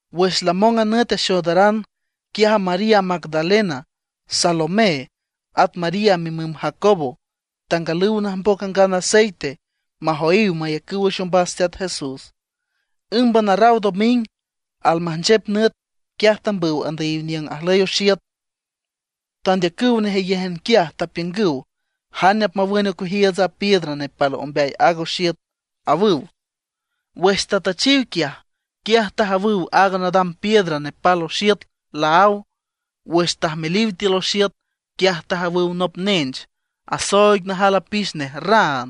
Wüx lamong a nüt axoodaran, quiaj María Magdalena, Salomé, at María mimüm Jacobo tangalüw najmboc angan aceite majoyiw mayacüw wüx ombas Teat Jesús. Ǘmban arraw doming almajnchep nüt, quiaj tambüw andüyiw niüng ajlüy oxiüt. Tandeacüw nejeyéjan quiaj, tapiüngüw: ―¿Jane apmawün ocueajiiüts a piedra nepal ombeay aaga oxiüt? ―awüw. Wüx tatüchiw quiaj, quiaj tajawüw aaga nadam piedra nepal oxiüt laáw. Wüx tajmeliw tiül oxiüt, quiaj tajawüw nop nench, asooig najal apix nej raan.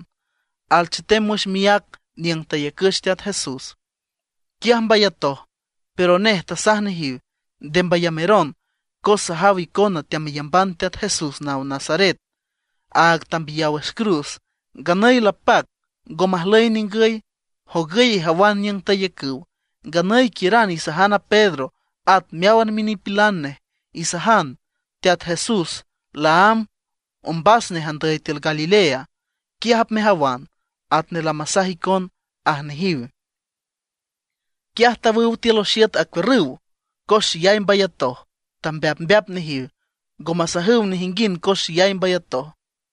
Alchetem wüx miác niüng tayacüch a Teat Jesús. Quiaj mbayatoj. Pero nej tasaj nejiw: ―Nde mbayameron, cos sajaw icona teameyamban Teat Jesús naw Nazaret, áag tambiyaw wüx cruz. Nganüy lapac, ngo majlüy ningüy. Jogüy ijawan niüng tayacüw. Nganüy quiüran isajan a Pedro at meáwan minipilan nej. Isajan: “Teat Jesús laámb ombas nej andüy tiül Galilea. Quiaj apmejawan, atnej lamasaj icon” ―aj nejiw. Quiaj tawüw tiül oxiüt acuiürrüw, cos xeyay mbayatoj, tambeapmbeap nejiw, ngo masajüw nejinguind cos xeyay mbayatoj.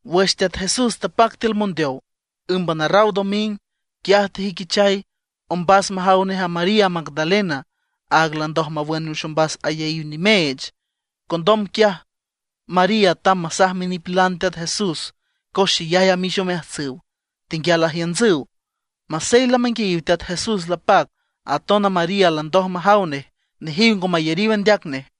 Wüx Teat Jesús tapac tiül mondeow ǘmban arraw doming, quiaj tejüiquichay ombas majaw nej a María Magdalena, aag landoj mawün wüx ombas ayaíw nimeech. Condom quiaj María tamb masaj minipilan Teat Jesús, cos xeyay amix omeajtsüw, tenguial ajiüntsüw. Masey lamanguiayiw Teat Jesús lapac, aton a María landoj majaw nej, nejiw ngo mayariw andeac nej.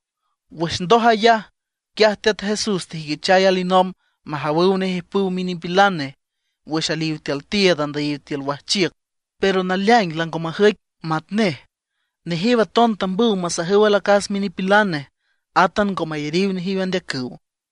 Wüx ndoj ayaj, quiaj Teat Jesús tejüiquichay alinomb majawüw nej ijpüw minipilan nej wüx aliw tiül tiiüd andüyiw tiül wajchiüc, pero naleaing lango majüic matnej. Nejiw aton tambüw masajüw alacas minipilan nej, átan ngo mayariw nejiw andeacüw.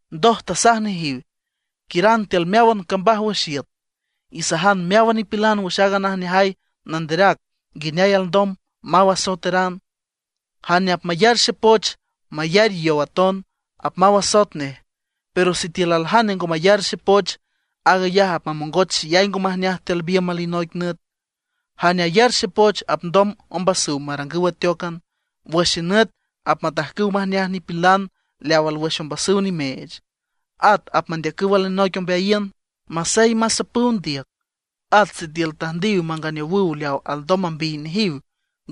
Ndoj tasaj nejiw: ―Quiüran tiül meáwan cambaj wüx iüt, isajan meáwan nipilan wüx aaga najneajay nanderac nguineay alndom maw asoeteran. Jane apmayar xepoch, mayar yow aton, apmaw asoet nej. Pero sitiül aljane ngo mayar xepoch, aag ayaj apmamongoch xeyay ngo majneaj tiül biümb alinoic nüt. Jane ayar xepoch apndom ombasüw marangüw ateócan. Wüx xenüt apmatajcüw majneaj nipilan leaw alwüx ombasüw nimeech; at apmandeacüw alinoic ombeayiün. Masey masapüw ndiüc; at sitiül tüjndiw manganeowüw leaw alndom mambiy nejiw,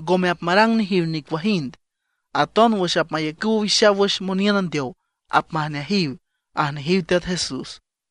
ngome apmarang nejiw nicuajind. Aton wüx apmayacüw owixaw wüx moniün andeow apmajneajiw ―aj nejiw Teat Jesús.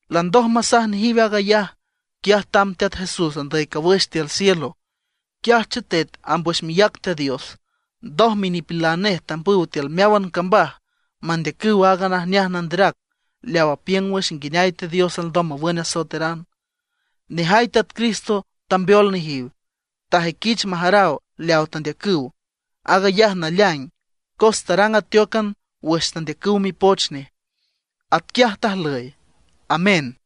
Landoj masaj nejiw aag ayaj, quiaj tamb Teat Jesús andüy cawüx tiül cielo. Quiaj chetet amb wüx miác Teat Dios. Ndoj minipilan nej tambüw tiül meáwan cambaj mandeacüw aaga najneajay nanderac leaw apiüng wüx nguineay Teat Dios alndom mawün asoeteran. Nejay Teat Cristo tambeol nejiw, tajüiquich majaraw leaw tandeacüw, aag ayaj naleaing, cos tarang ateócan wüx tandeacüw mipoch nej. Atquiaj tajlüy. Amén.